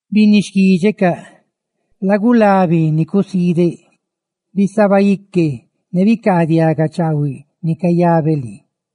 Binni xquídxecaꞌ, lagulabi ni cusiideꞌ; ¡bisaba ique ne bicaadiaga chaahuiꞌ ni cayabeꞌ lii!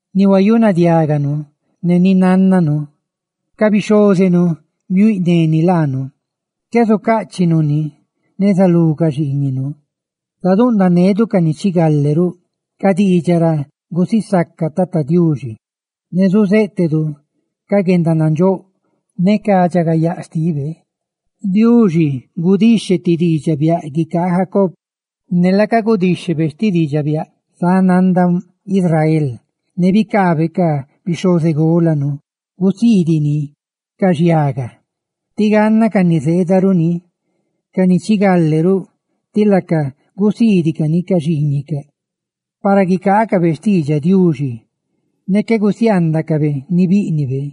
Ni huayunadiáganu ne ni nánnanu ca bixhózenu biuíꞌne ni laanu, qué zucáꞌchinu ni neza lú ca xiiñinu. Ca ni chigale ruꞌ zusisacanenu laacaꞌ Tata Diuxi, ne zuzéꞌtedu ca guendanandxóꞌ ne ca guendaridxagayaa xtibe. Diuxi gudixhe ti diidxaꞌ biaꞌ guicaa Jacob; ne laaca gudíxhebe sti diidxaꞌ biaꞌ sáꞌ nanda Israel, ne bicaabe ca bixhozególanu gusiidiꞌ ni ca ni zá de laacaꞌ, tí ganna ca ni zeedaruꞌ ni, ca ni chigale ruꞌ, ti laacaꞌ, laaca gusiidicani ca xiiñicaꞌ; para guicaacabe xtiidxaꞌ Diuxi ne qué gusiaandacabe ni bíꞌnibe;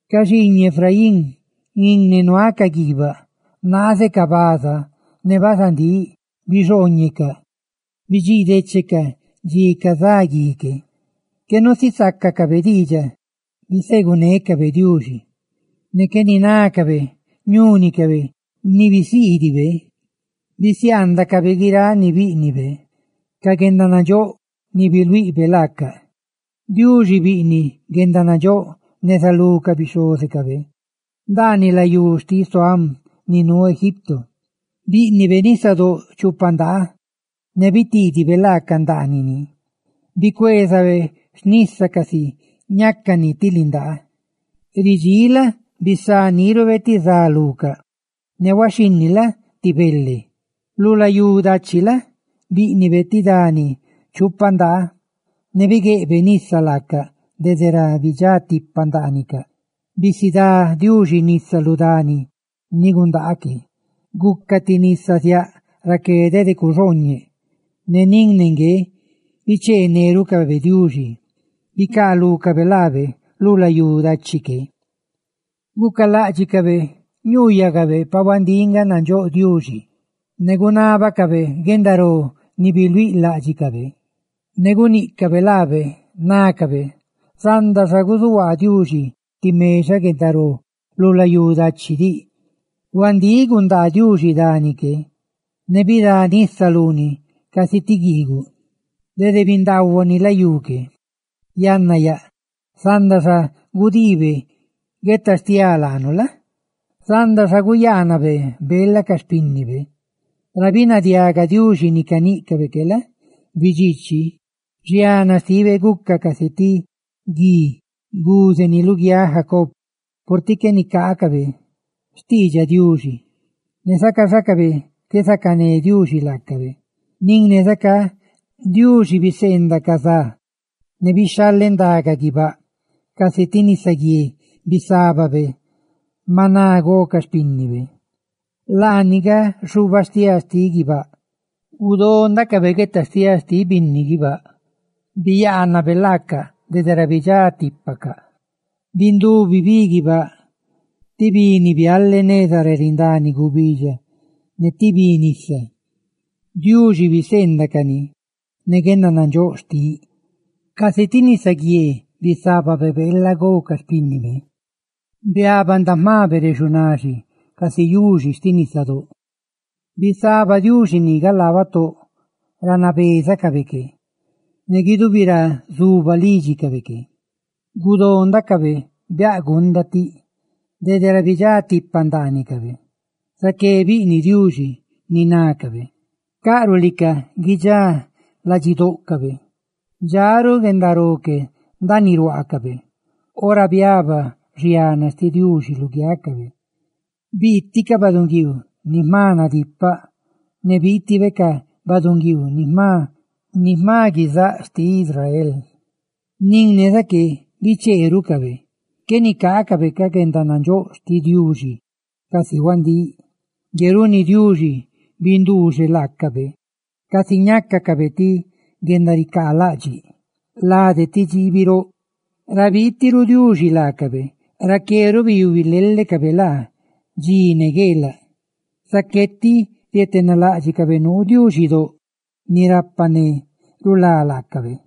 Ca xiiñiꞌ Efraín, nin ne nuacaꞌ guiibaꞌ naazecaꞌ baza ne bazandíꞌ, bidxiidechecaꞌ dxi cazá gui que; qué nusisácacabe diidxaꞌ bisegunécabe Diuxi, ne qué ninácabe ñúnicabe ni bisiidibe. Bisiaandacabe guiráꞌ ni bíꞌnibe, ca guendanandxóꞌ ni biluiꞌbe laacaꞌ. Diuxi biꞌniꞌ guendanandxóꞌ neza lú ca bixhózecabe ndaaniꞌ layú xtiꞌ Soan, ni nuu Egipto: bíꞌnibe nisadóꞌ chupa ndaa, ne bitiidibe laaca ndaaniꞌ ni, bicueezabe xnísani casi ñácani ti lindaa. Ridxíꞌ la? bisá nírube ti za lucaꞌ, ne huaxhinni la? ne xpiaaniꞌ ti bele. Lu layú dachi la? bíꞌnibe ti dani chupa ndaa, ne bigueꞌbe nisa laacaꞌ dede ra bidxá tipa ndaanicaꞌ. Bisidá Diuxi nisa lu dani ni gundaa que, guca ti nisa ziaꞌ raqué, dede cuxooñeꞌ. Ne nin ne ngue bicheenerucabe Diuxi; bicaalúcabe laabe lu layú dachi que. Gucaláꞌdxicabe ñuuyacabe pa huandíꞌ nga nandxóꞌ Diuxi, ne gunábacabe guendaró ni biluíꞌ láꞌdxicabe. Ne guníꞌcabe laabe, nácabe: «Zanda xa guzuhuaa Diuxi ti mexaꞌ guendaró lu layú dachi diꞌ. Huandíꞌ gundaa Diuxi dani que, ne bidá nisa luni casi ti guiiguꞌ, dede bindaahuani layú que; yanna yaꞌ, zanda xa gudiibe guetastiá laanu, zanda xa guyaanabe beela ca xpínnibe.» Ra binadiaga Diuxi ni caníꞌcabe que la? bidxiichi; ¡xiana xtibe, guca casi ti gui, guzeni luguiáꞌ Jacob! Purtiꞌ qué nicaacabe xtiidxaꞌ Diuxi, ne zacaxacabe qué zacané Diuxi laacabe. Nin ne zacá, Diuxi guníꞌ ne ca za, ne bixhalendaga guibáꞌ; ¡casi ti nisaguié bisábabe maná gó ca xpínnibe, laani nga xubastiáa xtiꞌ guibáꞌ! ¡Gudó ndácabe guetastiá xtiꞌ binni guibáꞌ! ¡Biyaana Diuxi laacaꞌ dede ra bidxá tipacaꞌ! Bindubi bi guibáꞌ, ti bi ni biale neza ra rindani gubidxa ne ti bi nisa; ¡Diuxi biseendaꞌ cani ne guendanandxóꞌ xtiꞌ! Casi ti nisaguié bisábabe beela gó ca xpínnibe; ¡biaba ndaꞌ jma bere xunaxi casi yuxi xtiꞌ nisadóꞌ! Bisaba Diuxi ni galaa batóꞌ ra nabézacabe que ne guidubi ra zuba lídxicabe que. Gudó ndácabe biaꞌ gunda tiꞌ dede ra bidxá tipa ndaanicabe, zaqué biꞌniꞌ Diuxi ni nácabe. Caꞌruꞌ lica guidxá ladxidóꞌcabe, dxa ruꞌ guendaró que ndaaniꞌ ruaacabe, ora biaba xiana xtiꞌ Diuxi lugiácabe, biiti ca baꞌdunguiiu ni jma nadipaꞌ. ¡Ne biitibe ca baꞌdunguiiu ni jma guizáꞌ xtiꞌ Israel! Nin ne zaqué, bicheerucabe; qué nicaacabe ca guendanandxóꞌ xtiꞌ Diuxi casi huandíꞌ. Ngue runi Diuxi binduuxeꞌ laacabe casi ñácacabe ti guendaricaalaꞌdxiꞌ lade ti dxiibi roꞌ. Ra biiti ruꞌ Diuxi laacabe, raqué ruꞌ biyubi lelecabe laa; dxi ne gueelaꞌ. Zaqué tiꞌ rietenaladxíꞌcabe nuu Diuxidóꞌ ni rapa ne rulá laacabe.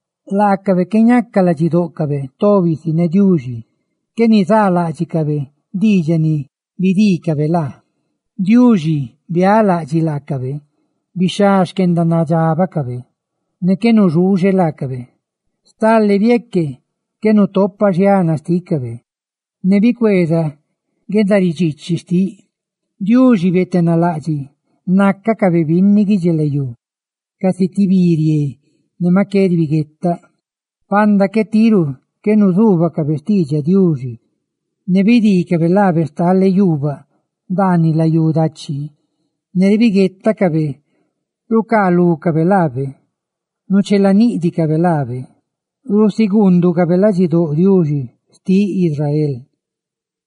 Laacabe qué ñaca ladxidóꞌcabe tobi si ne Diuxi, qué nizaaláꞌdxicabe diidxaꞌ ni bidiicabe laabe. Diuxi biálaꞌdxiꞌ laacabe, bixhá xquendanadxabacabe ne qué nuxuuxe laacabe; stale bieque qué nutopa xiana xtícabe, ne bicueeza guendaridxiichi xtiꞌ. Diuxi bietenalaꞌdxiꞌ nácacabe binni guidxilayú; casi ti bi, rie ne maꞌ qué ribiguetaꞌ. ¡Panda tiru qué nuzuubacabe xtiidxaꞌ Diuxi, ne bidiicabe laabe stale yuubaꞌ ndaaniꞌ layú dachib! Ne ribiguetacabe rucaalúcabe laabe, ruchelaniꞌdicabe laabe; ¡rusiguunducabe ladxidóꞌ Diuxi xtiꞌ Israel!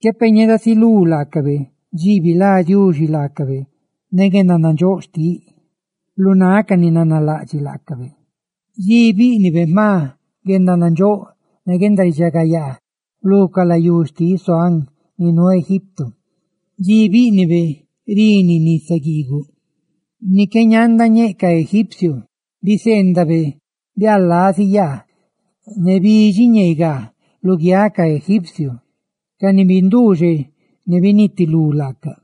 Qué peꞌ ñedasilú laacabe dxi que dxi bilá Diuxi laacabe ne guendanandxóꞌ xtiꞌ, lu náꞌ ca ni nanalaꞌdxiꞌ laacabe; dxi bíꞌnibe jma guendanandxóꞌ ne guendaridxagayaa, lu ca layú xtiꞌ Soan ni nuu Egipto; dxi bíꞌnibe rini nisa guiiguꞌ, ni qué ñanda ñeꞌ ca egipcio. Biseendabe biaꞌlazi yaa ne bidxiꞌ ñeegaa luguiáꞌ ca Egipcio, ca ni binduuxeꞌ ne binitilú laaca;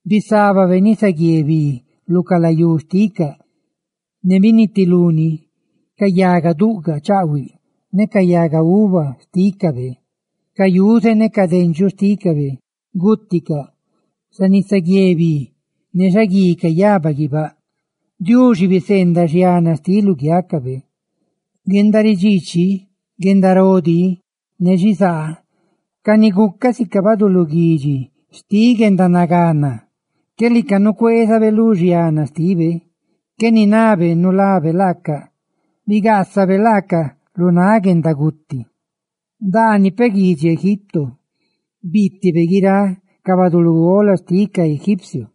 Bisábabe nisaguié bi lu ca layú xticaꞌ, ne binitiluni ca yaga duꞌgaꞌ chaꞌhuiꞌ ne ca yaga uva xtícabe. Ca yuze ne ca dendxuꞌ xtícabe, gúticaꞌ xa nisaguié bi ne xaguí cayaba guibáꞌ. Diuxi biseendaꞌ xiana xtiꞌ luguiácabe: guendaridxiichi, guendaró dí ne xizaa, ca ni gucaꞌ sica baduluguidxi xtiꞌ guendanagana. ¡Qué lica nucueezabe lu xiana xtibe! Qué ninabe nulabe laaca, bigaasabe laaca lu náꞌ guendaguti; ¡ndaaniꞌ peꞌ guidxi Egipto biitibe guiráꞌ ca baꞌduꞌ lugola xtiꞌ ca Egipcio!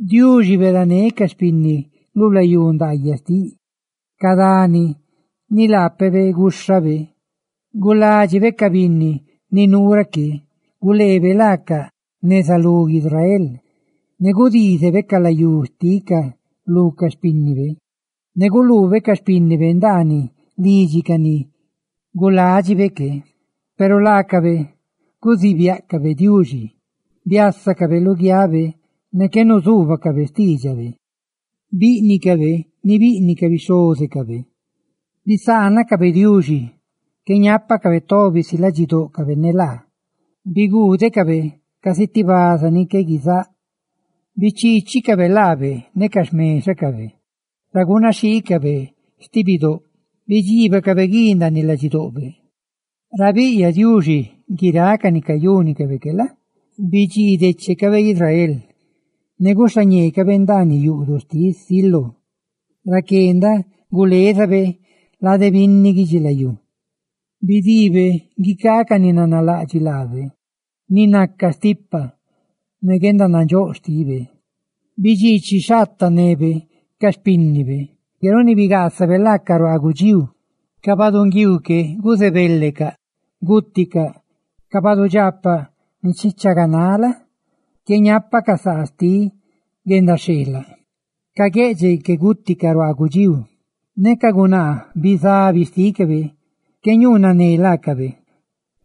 Diuxi beedané ca xpinni lu layú ndaayaꞌ xtiꞌ, ¡ca dani ni laapebe gúxhabe! Guládxibe ca binni ni nuu raqué, guleebe laaca neza lú Israel; ne gudiizibe ca layú xticaꞌ lú ca xpínnibe, ne guluube ca xpínnibe ndaaniꞌ lidxi ca ni guládxibe que. Peru laacabe guzíꞌ biáꞌcabe Diuxidóꞌ, biásacabe luguiabe, ne qué nuzuubacabe xtiidxabe; bíꞌnicabe ni biꞌniꞌ ca bixhózecabe, bisaanacabe Diuxi qué ñápacabe tobi si ladxidóꞌcabe ne laa; ¡biguudecabe casi ti baza ni qué guizáꞌ! Bichiichicabe laabe ne ca xmexacabe ra gunaxhiicabe sti bidóꞌ; ra gunaxhiicabe sti bidóꞌ, bidxiibacabe gui ndaaniꞌ ladxidoꞌbe. Ra biiꞌyaꞌ Diuxi guiráꞌ ca ni cayúnicabe que la? ne bidxiidechecabe Israel, ne guxhañeecábe ndaaniꞌ yuꞌduꞌ xtiꞌ Siló, raqué ndaꞌ gulezabe lade binni guidxilayú. Bidiibe guicaa ca ni nanalaꞌdxiꞌ laabe ni naca stipa ne guendanandxóꞌ xtibe. Bidxiichi xhaatanebe ca xpínnibe, ngue runi bigaasabe laaca ruaa gudxíu. Ca baꞌdunguiiu que guzebelecaꞌ, gúticaꞌ; ca badudxaapaꞌ ni nichaganaꞌ la? ¡qué ñápacaꞌ saa xtiꞌ guendaxheelaꞌ! Ca gueꞌdxeꞌ que gúticaꞌ ruaa gudxíu, ne ca gunaa bizabi xtícabe qué ñuunane laacabe.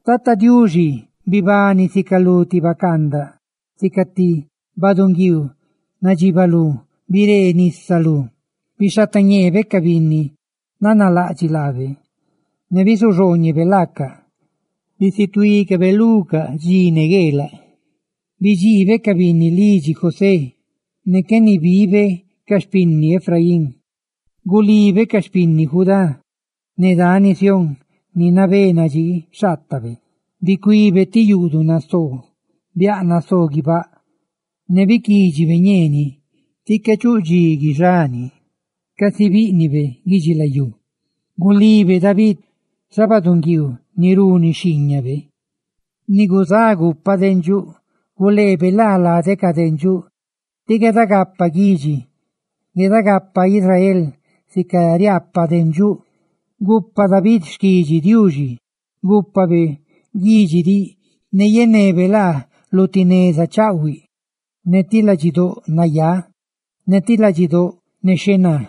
Tata Diuxi bibani, sica lu ti bacaandaꞌ, sica ti baꞌdunguiiu nadxibalú biree nisa lú, bixhatañeebe ca binni nanalaꞌdxiꞌ laabe, ne bisuxooñebe laacaꞌ; ¡bisituí cábe lucaꞌ dxi ne gueelaꞌ! Bidxiibe ca binni lidxi José, ne qué nibibe ca xpinni Efraín; gulibe ca xpinni Judá ne dani Sión ni nabé nadxii xhaatabe. Bicuíbe ti yuꞌduꞌ nasoo, biaꞌ nasoo guibáꞌ, ne biquídxibe ñeeniꞌ ti qué chuꞌ dxi guixani, casi bíꞌnibe guidxilayú. Gulibe David, xa baꞌdunguiiu ni runi xhiiñabe, ni guzá gupa dendxuꞌ; guleebe laa lade ca dendxuꞌ, tí gueeda gapaꞌ guidxi, gueeda gapaꞌ Israel sica riaapaꞌ dendxuꞌ. Ne gupa David xquidxi Diuxi; gúpabe guidxi diꞌ ne yenebe laa lu ti neza chaꞌhuiꞌ ne ti ladxidóꞌ nayá, ne ti ladxidóꞌ nexhená.